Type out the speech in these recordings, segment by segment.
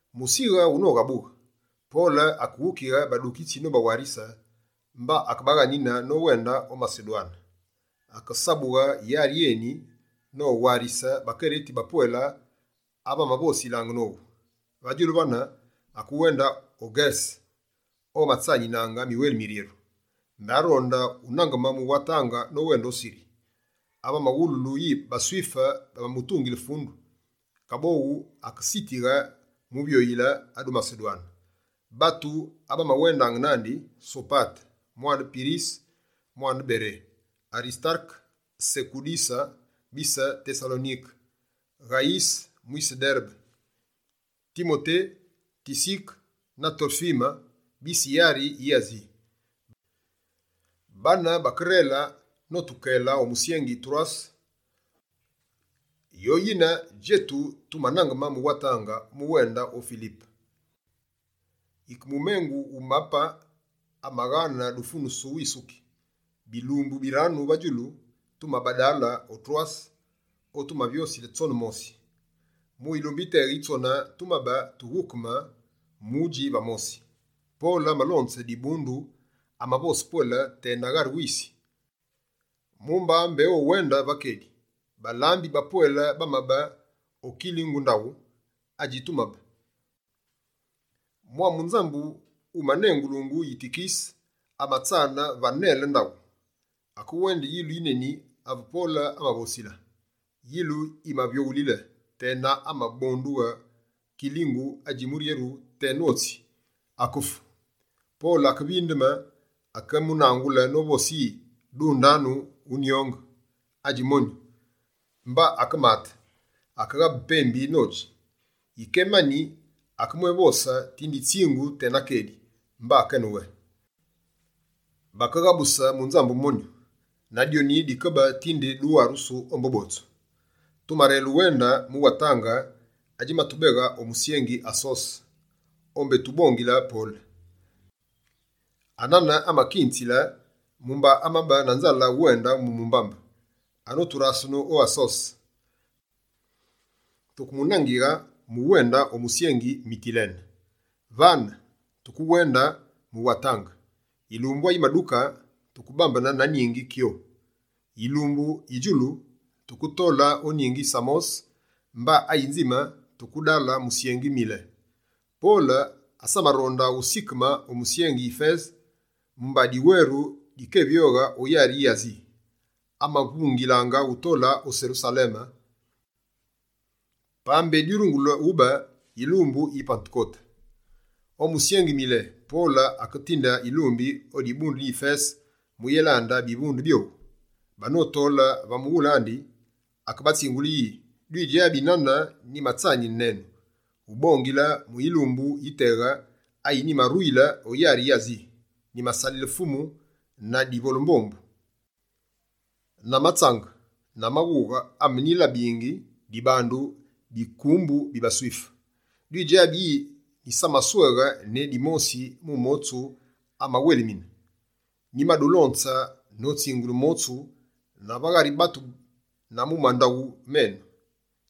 Musighe wunoghabughe, Pole akeghukighe badukitsi nobawarise, mba akebaghanine nowende o Masedwane. Akesabughe yari yeni, nowarise bakereti bapwele ave amavosilaange nowu. Va djulu vane, akewende o Ngerese o amatsanine miweli miryeru. Mbé aronde unangeme mu watange nowende o Siri, ave amawululu yi baSwife bamamutungile fundu. Kaboghu, akesitighe muvyoyile adu Masedwane. Batu abamawendaange nandi: Sopate mwane Pirise mwise Bere, Arisitareke Sekunduse bise Tesalonike, Ghayise mwise Derebe, Timote, Tisike na Torfime bise yari yi Asi. Bane bakerele notukele o musyengi Torwase. Yoyine djetu tumanangeme mu watange, mu wende o Filipe, yike mumengu wu bapembi abaghane dufunusu wisuki. Bilumbu biranu va djulu, tumabadale o Torwase o tumavyosile tsone mosi. Mu yilumbu yiteghe yi tsone, tumabe tughukeme mudji va mosi. Pole amalonze dibundu, amavose pwele tena ghari wisi, mumba mbé owende va kedi. Balambi bapwele bamabe o kilingu ndaghu adjitumabe. Mwa munzambu wumanengulungu Yitikise amatsane va nele ndaghu. Akewende yilu yineni ave Pole amavosila. Yilu yimavyoghulile, tena ave amabonduyile kilingu adji muryeru teno tsi. Akefu. Pole akevindeme, akemunaghule novose yi: «Dundanu wunyonge, adji monyu.» Mba akemate, akeghabe pembi nodji. Yike emani akemwévose tinde yitsingu tena kedi, mba akewende. Bakeghabuse munzambu monyu na dyoni dikebe tinde duwarusu ombu botsu. Tumarele uwende mu watange adjimatubeghe o musyengi Asose, o mbé tubongile Pole. Anane amakinzile, mumba amabe na nzale uwendile mu mumbambe. Anoturasene o Asose, tukemunangighe mu wende o musyengi Mitilene. Vane, tukewende mu watange. Yilumbu ayimaduke tukebambene na ningi Kyo. Yilumbu yi djulu, tuketole o ningi Samose, mba ayinzime tukedale musyengi Mile. Pole, asamaronde usikeme o musyengi Yifese, mumba diweru dikévyoghe o yari yi Asi. Amavungilaange utole o Serusaleme, pa mbé dyurungule ube yilumbu yi Patekote. O musyengi Mile, Pole aketinde yilumbi o dibundu di Yifese mu yélande bivunde byowu. Banotole va mughule andi, akebatsingule yi: «Dwidjabi nane nyimatsanine nenu, ubongile va yilumbu yiteghe ayi nyimaruyile o yari yi Asi. Nyimasalile Fumu na divole-mbombu, na matsange na maghughe amenyimalabe dibandu bikumbu bi baSwife. Dwidjabi yi nyisamasweghe ne dimosi mu motsu amawelimine. Nyimadulonze notsingule motsu, na va ghari batu na mu mandaghu menu.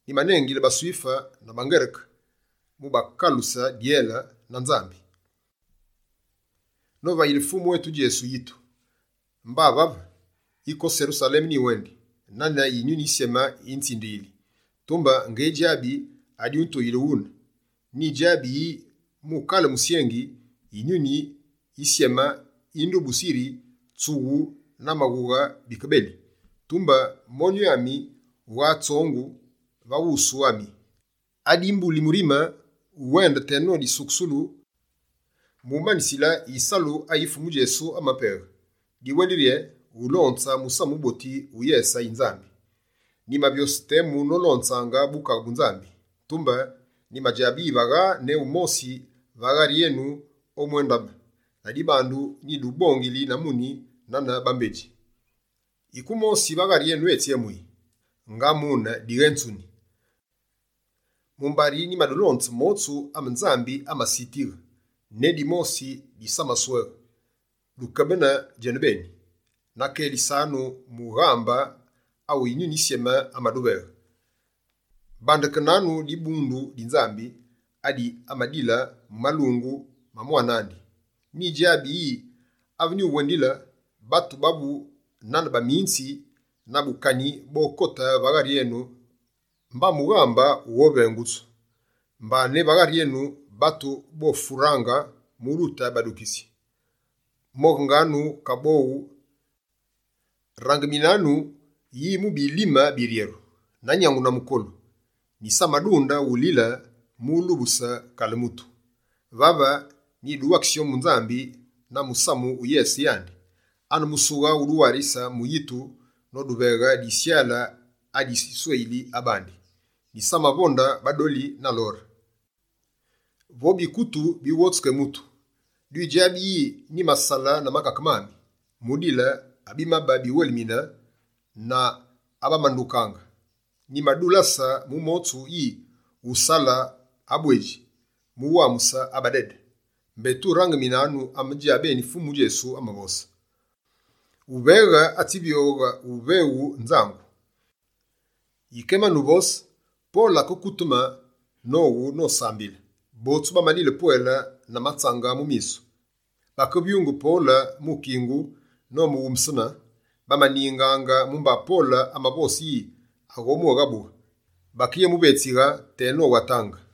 Nyimanengile baSwife na baNgereke mukalughe dyele na Nzambi, novayile Fumu etu Djesu yitu. Mba vave, yike o Serusaleme nyiwendi, nane Yinyuni Yisyeme yinzindiyili. Tumbe, ngedjabi adyutuyile ghune. Nyidjabi yi mu kale musyengi, Yinyuni Yisyeme yindubusi yiri, tsughu na maghughe bikeli. Tumbe, monyu ami wughane tsongu va wusu ami. Adimbuli murime, uwende teno disukusulu mu manisile yisalu ayi Fumu Djesu amapeghe. Diwendili rye: wulonze Musamu Wuboti wu yese yi Nzambi.» «Nyimavyose temu nolonzange Bukaghe bu Nzambi, tumbe nyimadjabe yi vagha ne wumosi va ghari enu omwéndabe. Ladibandu, nyidubongili na muni nane bambedji: yike wumosi va ghari enu etsyemuyi, nga mune dighénzuni. Mumba nyimadulonze motsu ame Nzambi amasitighe, ne dimosi nyisamasweghe. Dukebene djenubeni, na kelisanu mughambe, awu Yinyuni Yisyeme amaduveghe. Bandekenanu dibundu di Nzambi adi amadile mu malungu ma mwane andi. Nyidjabi yi ave nyuwendile, batu bavu nane baminzi ba bukani bokote va ghari enu mba mughambe wughovengusu. Mba ne va ghari enu, batu bofuraange mu dute badukitsi. Moghanu kaboghu! Rangeminanu yi, mu bilime biryeru, na nyangu na mukolu, nyisamadunde ulile mu ulubuse kale mutu. Vave, nyiduwakise ombu Nzambi na musamu wu yese yandi. Ane musughe uduwarise mu yitu, noduveghe disyale adi asweyile bandi. Nyisamavonde badoli na lore, vo bikutu bi wotsu ke mutu. Dwidjabi yi nyimasale na makake mami, mu dile abimabe biwelimine na abamandukaange. Nyimadulase mu motsu yusale abwedji mu wamuse abadede. Mbé turangiminanu ame djabeni Fumu Djesu amavose: “Uveghe atsivyo uveghu nzangu.”» Yike emani uvose, Pole akekuteme nowu nosambile. Botsu bamalile pwele na matsange mu misu, bakevyunge Pole mu kingu nomughumbesene. Bamaningaange mumba Pole amavose yi aghoghabughe. Bakeyemuvetsighe tena o watange.